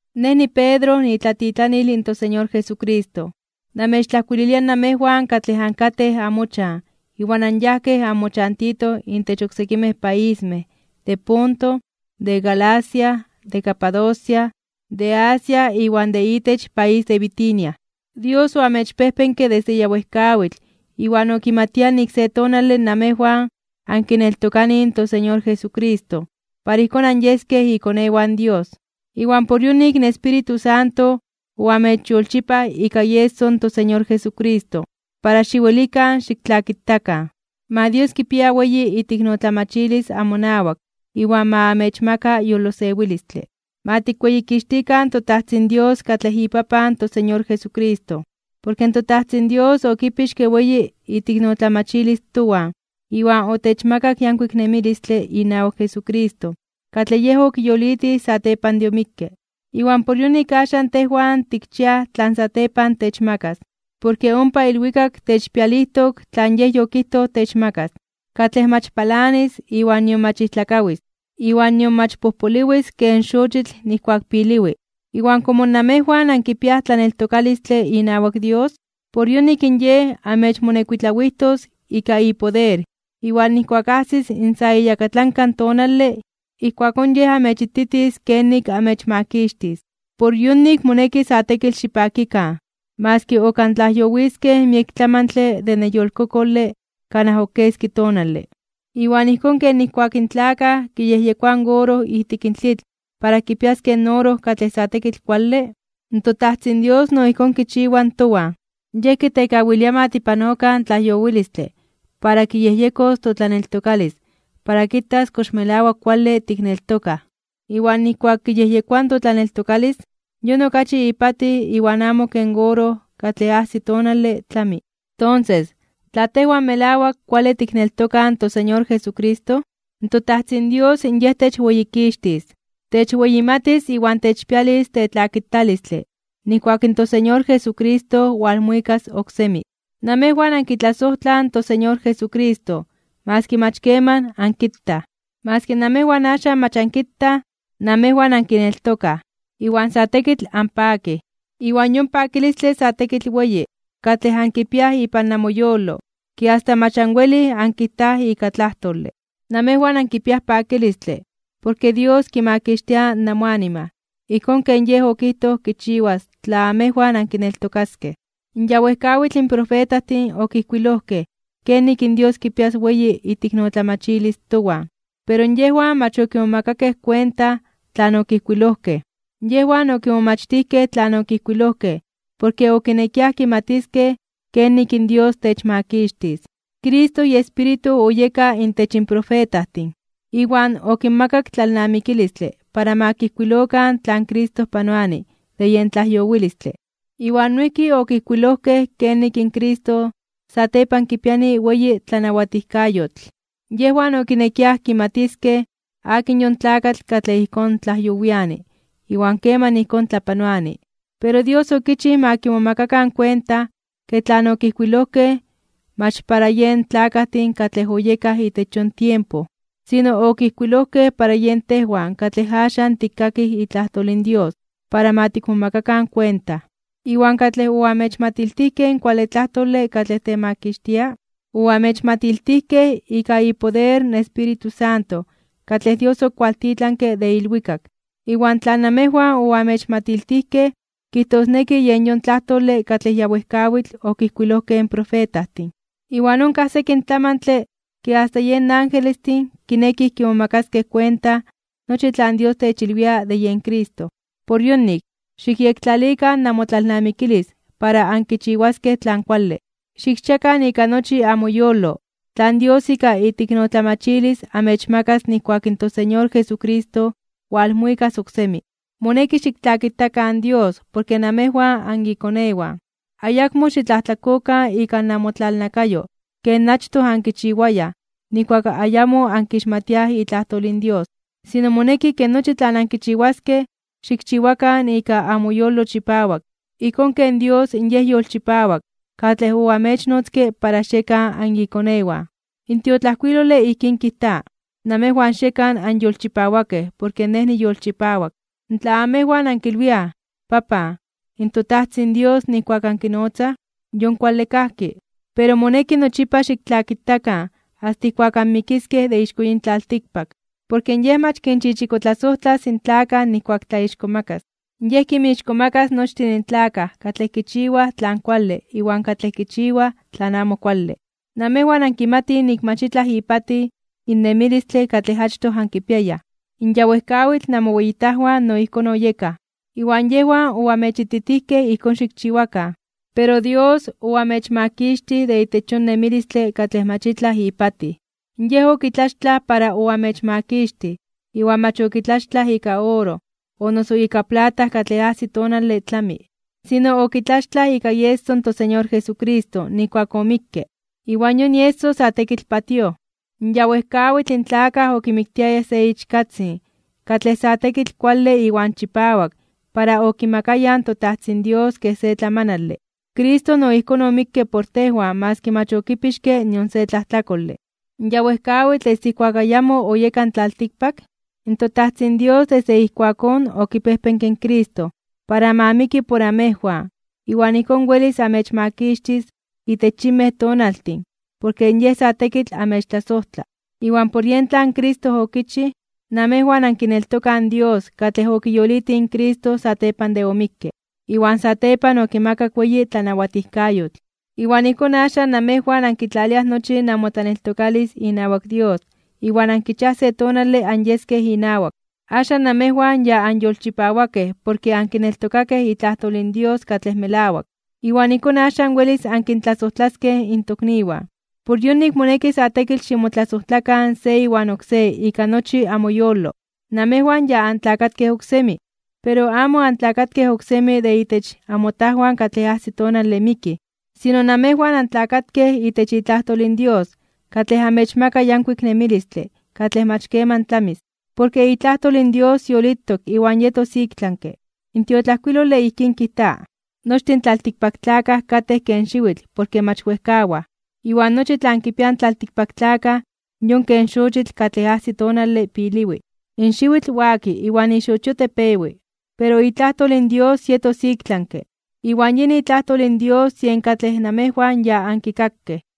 Nej niPedro, niitlatitlanil in toSeñor Jesucristo. Namechtlajkuililia namejwan katlej ankajtejkej amochan iwan anyajkej anmochantitoj intech oksekimej paismej de Ponto, de Galacia, de Capadocia, de Asia iwan de itech país de Bitinia. Dios oamechpejpenke desde ya wejkawitl iwan okimatia nik se tonale namejwan ankineltokanij in toSeñor Jesucristo para ijkón anyeskej ikonewan Dios. Iwan por yonik in Espíritu Santo oamechyolchipaj ika ieso in toSeñor Jesucristo para xiwelikan xiktlakitakan. Ma Dios kipia weyi iteiknotlamachilis amonawak iwan ma amechmaka yolosewilistle. Ma tikweyikixtikan toTajtzin Dios katlej iPapan toSeñor Jesucristo. Porke toTajtzin Dios okipixke weyi iteiknotlamachilis towan iwan otechmakak yankuik nemilistle inawak Jesucristo katlej Yej okiyolitij satepan de omikke. Iwan por yonik axan tejwan tikchiaj tlan satepan techmakas. Porke ompa ilwikak techpialijtok tlan Yej yokijtoj techmakas, katlej mach palanis iwan nion mach ijtlakawis, iwan nion mach pojpoliwis ken xochitl nijkuak piliwi. Iwan komo namejwan ankipiaj tlaneltokalistle inawak Dios, por yonik in Yej amechmonekuitlawijtos ika ipoder. Iwan nijkuak ajsis in sa iyakatlanka tonale, ijkuakón Yej amechititis kenik amechmakixtis. Por yonik moneki sa tekitl xipakikan, maski ok antlajyowiskej miek tlamantle de neyolkokole kanaj ok keski tonale. Iwan ijkón ken nijkuak in tlakaj kiyejyekoaj in oro ijtik tlitl para kipiaskej in oro katlej sa tekitl kuale, toTajtzin Dios no ijkón kichiwa towan. Yej kitekawilia ma tipanokan tlajyowilistle para kiyejyekos totlaneltokalis para kitas kox melawak kuale tikneltokaj. Iwan nijkuak kiyejyekoa totlaneltokalis, yon okachi ipatij iwan amo ken oro katlej ajsi tonale tlami. Tonses, tla tejwan melawak kuale tikneltokaj in toSeñor Jesucristo, in toTajtzin Dios Yej techweyikixtis, techweyimatis iwan techpialis tetlakitalistle nijkuak in toSeñor Jesucristo walmuikas oksemi. Namejwan ankitlasojtlaj in toSeñor Jesucristo maski mach keman ankitaj. Maski namejwan axan mach ankitaj, namejwan ankineltokaj, iwan sa tekitl anpakij. Iwan yon pakilistle sa tekitl weyi katlej ankipiaj ipan amoyolo ke asta mach anwelij ankijtaj ika tlajtole. Namejwan ankipiaj pakilistle porke Dios kimakixtia namoanima ijkón ken Yej okijtoj kichiwas tla amejwan ankineltokaskej. Ya wejkawitl in profetajtin okijkuilojkej kenik in Dios kipias weyi iteiknotlamachilis towan, pero yejwan mach okimomakakej kuenta tlan okijkuilojkej. Yejwan okimomachtijkej tlan okijkuilojkej porke okinekiaj kimatiskej kenik in Dios techmakixtis. Cristo iEspíritu oyeka intech in profetajtin, iwan okinmakak tlalnamikilistle para ma kijkuilokan tlan Cristo panoani de yen tlajyowilistle. Iwan noijki okijkuilojkej kenik in Cristo satepan kipiani weyi tlanawatijkayotl. Yejwan okinekiaj kimatiskej akin yon tlakatl katlej ijkón tlajyowiani iwan keman ijkón tlapanoani. Pero Dios okichij ma kimomakakan kuenta ke tlan okijkuilojkej mach para yen tlakajtin katlej oyekaj itech yon tiempo. Sino okijkuilojkej para yen tejwan katlej axan tikkakij itlajtol in Dios para ma tikmomakakan kuenta. Iwan katlej oamechmatiltijkej in kuale tlajtole katlej temakixtia, oamechmatiltijkej ika ipoder in Espíritu Santo katlej Dios okualtitlanke de ilwikak. Iwan tlan namejwan oamechmatiltijkej kijtosneki yen yon tlajtole katlej ya wejkawitl okijkuilojkej in profetajtin. Iwan onkaj sekin tlamantle ke asta yen angelestin kinekij kimomakaskej kuenta nochi tlan Dios techilwia de yen Cristo. Por yonik, xikyektlalikan namotlalnamikilis para ankichiwaskej tlan kuale. Xikchiakan ika nochi amoyolo tlan Dios ika iteiknotlamachilis amechmakas nijkuak in toSeñor Jesucristo walmuikas oksemi. Moneki xiktlakitakan Dios porke namejwan anikonewan. Ayakmo xitlajtlakokan ika namotlalnakayo ken achtoj ankichiwayaj nijkuak ayamo ankixmatiaj itlajtol in Dios. Sino, moneki ke nochi tlan ankichiwaskej xikchiwakan ika amoyolo chipawak, ijkón ken Dios Yej yolchipawak katlej oamechnotzke para xiekan anikonewan. In tiotlajkuilole ijkín kijta: “Namejwan xiekan anyolchipawakej porke Nej niyolchipawak.” Tla amejwan ankilwiaj “Papan” in toTajtzin Dios nijkuak ankinotzaj, in yon kuale kajki, pero moneki nochipa xiktlakitakan asta ijkuak anmikiskej de ixko yin tlaltikpak, porke Yej mach kinchichikotlasojtlas in tlakaj nijkuak tlaixkomakas (tlatzonmanas). Yej kinmixkomakas nochtin tlakaj katlej kichiwaj tlan kuale iwan katlej kichiwaj tlan amo kuale. Namejwan ankimatij nik mach itlaj ipatij in nemilistle katlej achtoj ankipiayaj. In ya wejkawitl namoweyitajwan no ijkón oyekaj, iwan yejwan oamechititijkej ijkón xikchiwakan. Pero Dios oamechmakixtij de itech yon nemilistle katlej mach itlaj ipatij. Yej okitlaxtlaj para oamechmakixtij iwan mach okitlaxtlaj ika oro o noso ika plata katlej ajsi tonale tlami. Sino okitlaxtlaj ika ieso in toSeñor Jesucristo nijkuak omikke, iwan yon ieso sa tekitl patíoj. Ya wejkawitl in tlakaj okimiktiayaj se ichkatzin katlej sa tekitl kuale iwan chipawak para okimakayaj in toTajtzin Dios kej se tlamanale, Cristo no ijkón omikke por tejwan maski mach okipixke nion se tlajtlakole. Ya wejkawitl desde ijkuak ayamo oyeka in tlaltikpak, in toTajtzin Dios desde ijkuakón okipejpenke in Cristo para ma miki por amejwan iwan ijkón welis amechmakixtis itech yinmej tonaltin porke Yej sa tekitl amechtlasojtla. Iwan por yen tlan Cristo okichij, namejwan ankineltokaj in Dios katlej okiyolitij in Cristo satepan de omikke, iwan satepan okimakak weyi tlanawatijkayotl. Iwan ijkón axan namejwan ankitlaliaj nochi namotlaneltokalis inawak Dios iwan ankichiaj se tonale anyeskej inawak. Axan namejwan ya anyolchipawakej porke ankineltokakej itlajtol in Dios katlej melawak, iwan ijkón axan welis ankintlasojtlaskej in tokniwan. Por yonik moneki sa tekitl ximotlasojtlakan se iwan oksé ika nochi amoyolo. Namejwan ya antlakatkej oksemi, pero amo antlakatkej oksemi de intech amotajwan katlej ajsi tonale mikij, sino namejwan antlakatkej itech itlajtol in Dios katlej amechmaka yankuik nemilistle katlej mach keman tlamis. Porke itlajtol in Dios yolitok iwan yetos iktlanke (ik tlami). In tiotlajkuilole ijkín kijta: Nochtin tlaltikpaktlakaj katej ken xiwitl porke mach wejkawaj. Iwan nochi tlan kipiaj in tlaltikpaktlakaj yon ken xochitl katlej ajsi tonale piliwi. In xiwitl waki iwan ixochio tepewi. Pero itlajtol in Dios yetos iktlanke (ik tlami). Iwan yin itlajtol in Dios yen katlej namejwan ya ankikakej.